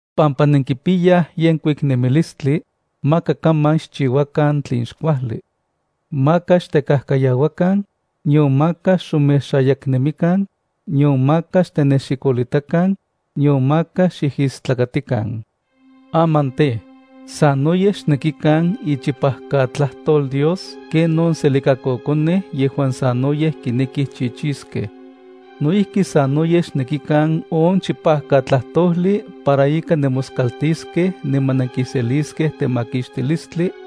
Pampa nenkipiyaj yenkuik nemilistli, maka kaman xchiuakan tlen xkuajli. Maka xtekajkayauakan, nion maka xomexayaknemikan, nion maka xtenexikolitakan, nion maka xijistlakatikan. Aman tej, sanoyej xnekikan ichipajkatlajtol Dios ken on selikakokonej yejuan sanoyej kinekij chichiskej. No ijki sanoyej xnekikan on chipajkatlajtojli para ika nemoskaltiskej niman nenkiseliskej temakixtilistli,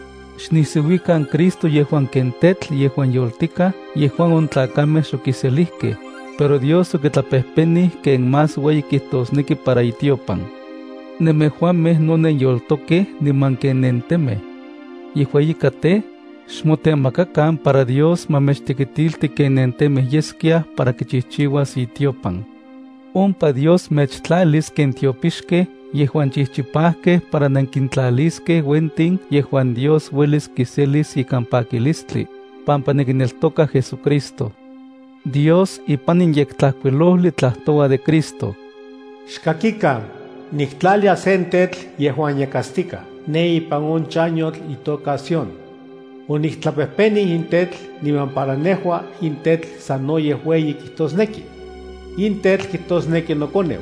Xnisiuikan Cristo yejuan ken tetl yejuan yoltikaj yejuan on tlakamej xokiselijkej, pero Dios okitlapejpenij ken más ueyi kitosneki para itiopan. Nemejuamej no nenyoltokej niman ken nentemej. Yejua ika tej, xmotemakakan para Dios ma mechtekitilti ken nentemej yeskiaj para kichijchiuas itiopan. Ompa Dios mechtlalis ken tiopixkej yejuan chijchipajkej para nenkintlaliskej uentin yejuan Dios uelis kiselis ikan pakilistli, pampa nenkineltokaj JesuCristo. Dios ipan in Yektlajkuilojli tlajtoua de Cristo: Xkakikan, niktlalia sen tetl yejuan yakatstikaj ne ipan on chanyotl itoka Sión. Oniktlapejpenij in tetl, niman para nejua in tetl sanoyej ueyi kijtosneki. In tetl kijtosneki noKoneu.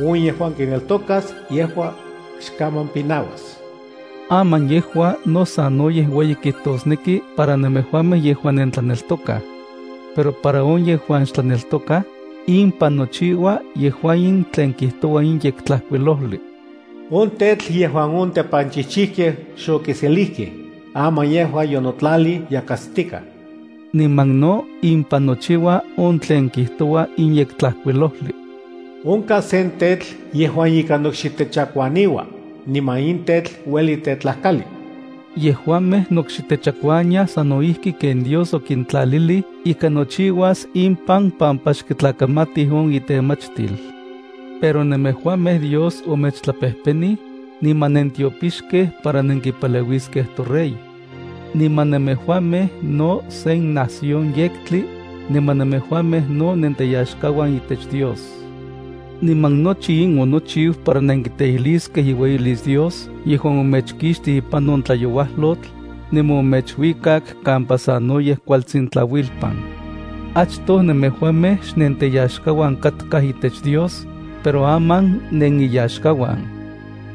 On yejuan kineltokas yejua, xkaman pinauas. Aman yejua no sanoyej ueyi kijtosneki para nemejuamej yejuan nentlaneltokaj. Pero para on yejuan xtlaneltokaj, impan nochiua yejua in tlen kijtoua in Yektlajkuilojli: “On tetl yejuan on tepanchijchijkej xokiselijkej, aman yejua yonotlalij yakatstikaj.” Niman no impan nochiua on tlen kijtoua in Yektlajkuilojli: “Onkaj se tetl yejuan ika nokxitechakuaniua, niman in tetl ueli tetlajkali.” Yejuamej nokxitechakuaniaj sano ijki ken Dios okintlalilij ika nochiuas impan pampa xkitlakamatij on itemachtil. Pero nemejuamej Dios omechtlapejpenij, niman nentiopixkej para nenkipaleuiskej toRey. Niman nemejuamej no sen nación yektli, niman nemejuamej no nenteyaxkauan itech Dios. Niman nochi in onochiu para nenkiteijliskej iueyilis Dios yejuan omechkixtij ipan on tlayauajlotl, niman omechuikak kampa sanoyej kuatsin tlauilpan. Achtoj nemejuamej xnenteyaxkauan katkaj itech Dios, pero aman neniyaxkauan.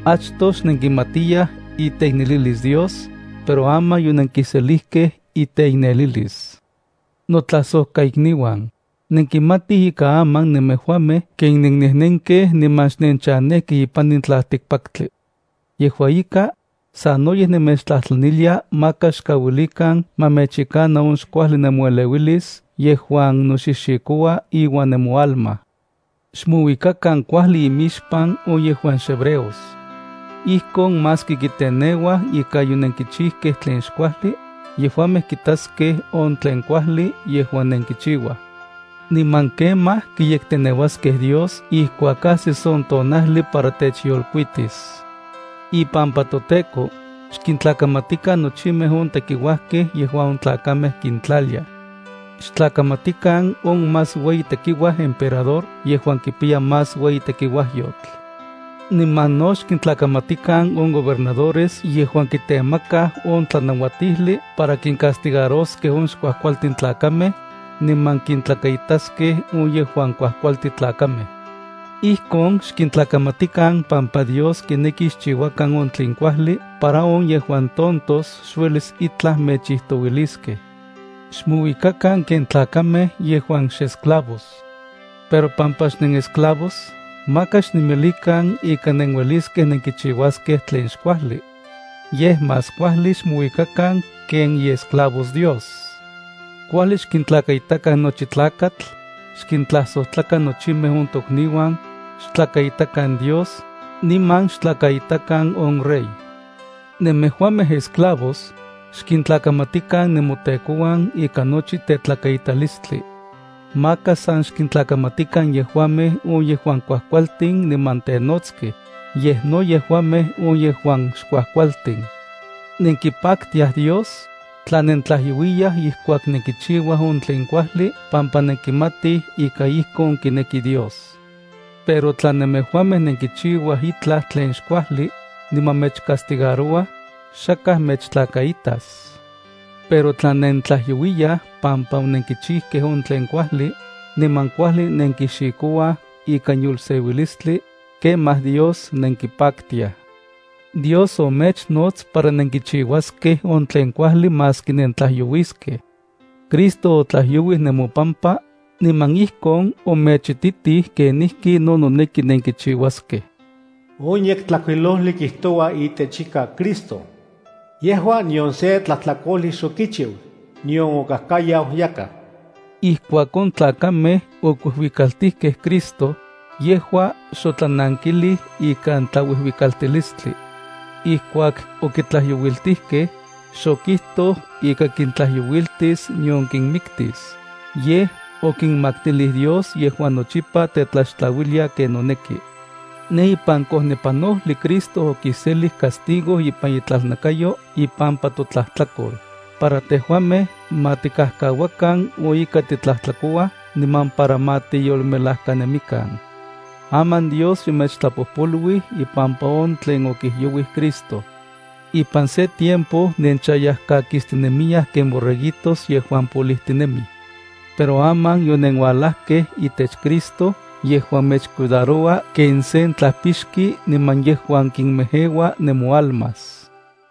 Achtoj xnenkimatiyaj iteiknelilis Dios, pero aman yonenkiselijkej iteiknelilis. Notlajsojkaikniuan, nenkimatij ika aman nemejuamej ken nennejnenkej niman xnenchanejkej ipan in tlaltikpaktli. Yejua ika, sanoyej nemechtlajtlanilia maka xkauilikan ma mechyekana on xkuajli nemoeleuilis yejuan noxixikoua iuan nemoalma. Xmouikakan kuajli imixpan on yejuan xhebreos. Ijkon maski kiteneuaj ika yonenkichijkej tlen xkuajli, yejuamej kitaskej on tlen kuajli yejuan nenkichiuaj. Niman kemaj kiyekteneuaskej Dios ijkuak ajsis on tonajli para techyolkuitis. Ipampa toTEKO, xkintlakamatikan nochimej on tekiuajkej yejuan on tlakamej kintlaliaj. Xtlakamatikan on más ueyi tekiuaj emperador yejuan kipiya más ueyi tekiuajyotl. Niman no xkintlakamatikan on gobernadores yejuan kitemakaj on tlanauatijli para kincastigaroskej on xkuajkualtin tlakamej, niman kintlakaitaskej on yejuan kuajkualti tlakamej. Ijkon xkintlakamatikan pampa Dios kineki xchiuakan on tlen kuajli para on yejuan tontos xuelis itlaj mechijtouiliskej. Xmouikakan ken tlakamej yejuan xesclavos. Pero pampa xnenesclavos maka xnemilikan ika nenueliskej nenkichiuaskej tlen xkuajli. Yej más kuajli xmouikakan ken iesclavos Dios. Kuajli xkintlakaitakan nochi tlakatl, xkintlajsojtlakan nochimej on tokniuan, xtlakaitakan Dios, niman xtlakaitakan on rey. Nemejuamej esclavos, xkintlakamatikan nemotekouan ikan nochi tetlakaitalistli. Maka san xkintlakamatikan yejuamej on yejuan kuajkualtin niman tenotskej, yej no yejuamej on yejuan xkuajkualtin. Nenkipaktiaj Dios, tla nentlajyouiyaj ijkuak nenkichiuaj on tlen kuajli pampa nenkimatij ika ijkon kineki Dios. Pero tla nemejuamej nenkichiuaj itlaj tlen xkuajli, niman mechcastigarouaj, xakaj mechtlakaitas. Pero tla nentlajyouiyaj pampa onenkichijkej on tlen kuajli, niman kuajli nenkixikouaj ikan yolseuilistli, kemaj Dios nenkipaktiaj. Dios omechnots para nenkichiuaskej on tlen kuajli maski nentlajyouiskej. Cristo otlajyouij nemopampa, niman ijkon omechititij kenijki no noneki nenkichiuaskej. On Yektlajkuilojli kijtoua itech ika Cristo: “Yejua nion se tlajtlakojli xokichiu, nion okajkayau yakaj.” Ijkuak on tlakamej okuijuikaltijkej Cristo, yejua xotlanankilij ikan tlauijuikaltilistli. Ijkuak okitlajyouiltijkej, xokijtoj ika kintlayouiltis nion kinmiktis, yej okinmaktilij Dios yejuan nochipa tetlaxtlauilia ken noneki. Ne ipan kojnepanojli Cristo okiselij castigo ipan itlalnakayo ipampa totlajtlakol, para tejuamej ma tikajkauakan on ika titlajtlakouaj niman para ma tiyolmelajkanemikan. Aman Dios yomechtlapojpoluij ipampa on tlen okijyouij Cristo. Ipan se tiempo nenchayajkakistinemiyaj ken borreguitos yejuan polijtinemij. Pero aman yonenualajkej itech Cristo yejuan mechcuidaroua ken sen tlajpixki niman yejuan kimejeua nemoalmas.